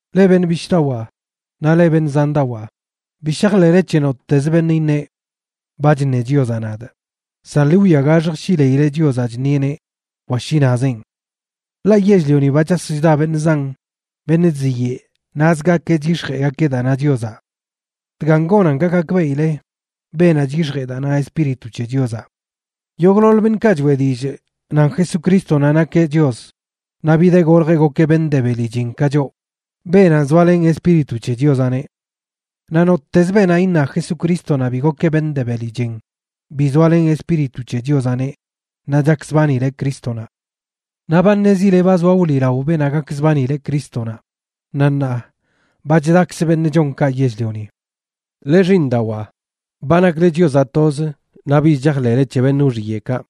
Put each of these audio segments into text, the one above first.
Leꞌ beṉꞌ bishꞌdawaa naꞌ leꞌ beṉꞌ zandawaa, bi shajḻeꞌle c̱he nottez beṉꞌ iṉeꞌ: “Ba chṉe Chiozaꞌ nadꞌ”, san ḻi wwiagaxjə shi leileꞌ Chiozaꞌ chṉieꞌneꞌ wa shi nazeꞌn. Ḻaꞌ yell-lioni ba chas chda beṉꞌ zan beṉꞌ chziyeꞌ nazgakeꞌ chyix̱jeꞌgakeꞌ daa na Chiozaꞌ. Dgan gonan ka gakbeꞌile beenaꞌ chyix̱jee daa na Espíritu c̱he Chiozaꞌ: yogꞌḻoḻ beṉꞌkaꞌ choꞌe dillꞌ nan Jesucrístonaꞌ nakeꞌ Chios naꞌ bideꞌ goljeꞌ gokeꞌ beṉꞌ de beli chen ka choꞌ, beenanꞌ zoalen Espíritu c̱he Chiozaꞌneꞌ. Naꞌ nottez beenaꞌ iṉa Jesucrístonaꞌ bi gokeꞌ beṉꞌ de beli chen, bi zoalen Espíritu c̱he Chiozaꞌneꞌ naꞌ chakzbanileꞌ Crístonaꞌ. Naꞌ ba ṉezile ba zoa wliꞌlao beenaꞌ gakzbanileꞌ Crístonaꞌ, naꞌ ṉaa ba chdakz beṉꞌ chon kaꞌ yell-lioni. Leꞌ xiiṉdawaa, ba nakle Chiozaꞌ tozə, naꞌ bich chajḻeꞌle c̱he beṉꞌ wxiyeꞌkaꞌ,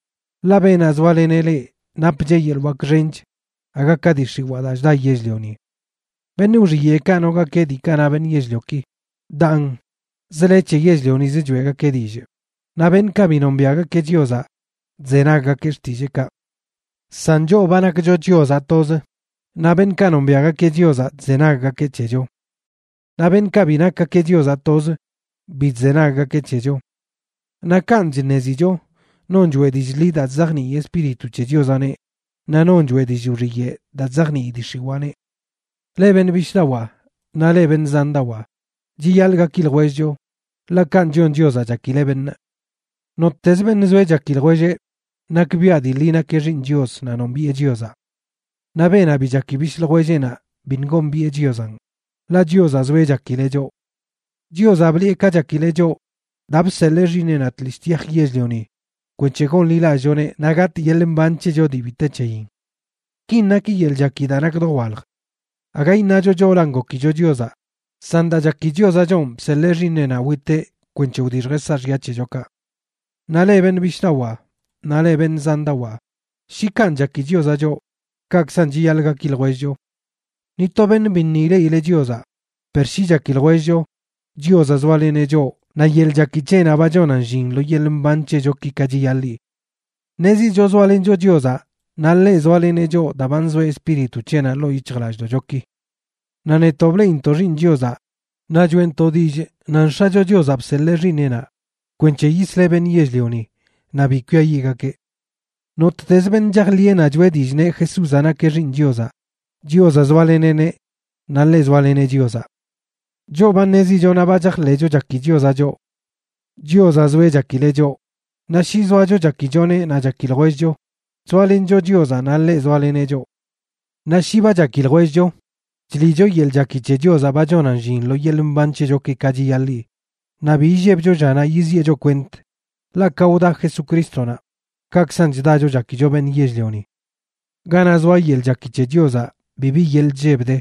ḻaꞌ beenaꞌ zoaleneꞌ leꞌ napcheꞌ yeḻꞌ wak xench aga ka dii x̱iwaa daa chda yell-lioni. Beṉꞌ wxiyeꞌkaꞌ nogakeꞌ diikaꞌ na beṉꞌ yell-lioki, daan, zle c̱he yell-lionizə choeꞌgakeꞌ dillꞌ, naꞌ beṉꞌkaꞌ bi nombiaꞌgakeꞌ Chiozaꞌ chzenaggakeꞌ xtilleekaꞌ. San choꞌ ba nakcho Chiozaꞌ tozə, naꞌ beṉꞌkaꞌ nombiaꞌgakeꞌ Chiozaꞌ chzenaggakeꞌ c̱hecho. Naꞌ beṉꞌkaꞌ bi nakgakeꞌ Chiozaꞌ tozə, bi chzenaggakeꞌ c̱hecho. Naꞌ kanꞌ chṉezicho non choꞌe dillꞌ ḻi daa chzajnii Espíritu c̱he Chiozaꞌneꞌ naꞌ non choꞌe dillꞌ wxiyeꞌ daa chzajnii dii x̱iwaaneꞌ. Leꞌ beṉꞌ bishꞌdawaa naꞌ leꞌ beṉꞌ zandawaa, chiyaḻꞌ gaki ljwellcho, ḻaꞌ kanꞌ chon Chiozaꞌ chakileꞌ beṉꞌ. Nottezə beṉꞌ zoeꞌ chaki ljwelleꞌ, nakbiaꞌ dii ḻi nakeꞌ xiiṉ Chios naꞌ nombiꞌe Chiozaꞌ. Naꞌ beenaꞌ bi chaki bishꞌ ljwelleꞌnaꞌ biṉꞌ gombiꞌe Chiozanꞌ, ḻaꞌ Chiozaꞌ zoeꞌ chakileꞌ choꞌ. Chiozaꞌ bliꞌe ka chakileꞌ choꞌ daa bseḻee Xiiṉeꞌnaꞌ tlishꞌ tyaj yell-lioni kwenc̱he gonḻilallꞌchoneꞌ naꞌ gatꞌ yeḻꞌ mban c̱hecho dii bi te c̱heyin. Kin nak yeḻꞌ chaki daa nak dowalj: aga iṉacho choꞌlan gokicho Chiozaꞌ, san daa chaki Chiozaꞌ chonꞌ bseḻee Xiiṉeꞌnaꞌ witeꞌ kwenc̱he wdixjeꞌ saaxya c̱hechokaꞌ. Naꞌ leꞌ beṉꞌ bishꞌdawaa naꞌ leꞌ beṉꞌ zandawaa, shi kanꞌ chaki Chiozaꞌ choꞌ, kaꞌkzan chiyaḻꞌ gaki ljwellcho. Ni to beṉꞌ biṉꞌ ileꞌileꞌ Chiozaꞌ, per shi chaki ljwellcho, Chiozaꞌ zoaleneꞌ choꞌ naꞌ yeḻꞌ chaki c̱heꞌnaꞌ ba chonan llin lo yeḻꞌ mban c̱hechoki ka chiyaḻi. Ṉezicho zoalencho Chiozaꞌ naꞌ ḻeꞌ zoaleneꞌ choꞌ daa ba nzoeꞌ Espíritu c̱heꞌnaꞌ ḻoo yic̱hjlallꞌdoꞌchoki. Naꞌ netoꞌ bleꞌintoꞌ Xiiṉ Chiozaꞌ naꞌ choeꞌntoꞌ dillꞌ nan X̱acho Chiozaꞌ bseḻee Xiiṉeꞌnaꞌ kwenc̱he yisleꞌ beṉꞌ yell-lioni naꞌ bi kwiayiꞌgakeꞌ. Nottezə beṉꞌ chajḻiꞌe naꞌ choꞌe dillꞌ neꞌ Jesúzaꞌ nakeꞌ Xiiṉ Chiozaꞌ, Chiozaꞌ zoaleneꞌneꞌ naꞌ ḻeꞌ zoaleneꞌ Chiozaꞌ. Choꞌ ba ṉezicho naꞌ ba chajḻeꞌcho chaki Chiozaꞌ choꞌ. Chiozaꞌ zoeꞌ chakileꞌ choꞌ, naꞌ shi zoacho chakichoneꞌ naꞌ chaki ljwellcho, zoalencho Chiozaꞌ naꞌ ḻeꞌ zoaleneꞌ choꞌ. Naꞌ shi ba chaki ljwellcho, chliꞌcho yeḻꞌ chaki c̱he Chiozaꞌ ba chonan llin lo yeḻꞌ mban c̱hechoki ka chiyaḻi, naꞌ bi illebcho llanaꞌ yiziꞌe choꞌ kwent, ḻaꞌ ka wda Jesucrístonaꞌ kaꞌkzan chdacho chakicho beṉꞌ yell-lioni. Ganaꞌ zoa yeḻꞌ chaki c̱he Chiozaꞌ bibi yeḻꞌ chlleb de.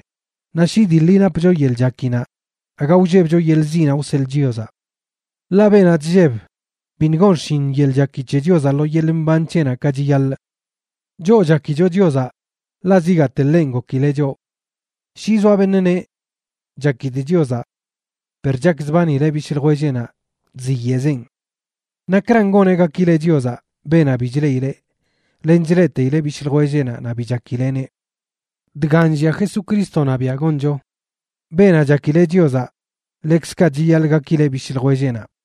Naꞌ shi dii ḻi napcho yeḻꞌ chakinaꞌ aga wllebcho yeḻꞌ ziꞌnaꞌ wseḻꞌ Chiozaꞌ. Ḻaꞌ beenaꞌ chlleb, biṉꞌ gon xshin yeḻꞌ chaki c̱he Chiozaꞌ lo yeḻꞌ mban c̱heꞌnaꞌ ka chiyaḻꞌ. Choꞌ chakicho Chiozaꞌ, ḻaꞌ zigaate ḻenꞌ gokileꞌ choꞌ. Shi zoa beṉꞌ neꞌ: “Chakidꞌ Chiozaꞌ”, per chakzbanileꞌ bishꞌ ljwelleꞌnaꞌ, chziyeꞌzeꞌn. ¿Nakran goneꞌ gakileꞌ Chiozaꞌ, beenaꞌ bi chleꞌileꞌ, len chleꞌitele bishꞌ ljwelleꞌnaꞌ naꞌ bi chakileꞌneꞌ? Dgan nllia Jesucrístonaꞌ biaꞌ goncho: Beenaꞌ chakileꞌ Chiozaꞌ, ḻekzkaꞌ chiyaḻꞌ gakileꞌ bishꞌ ljwelleꞌnaꞌ.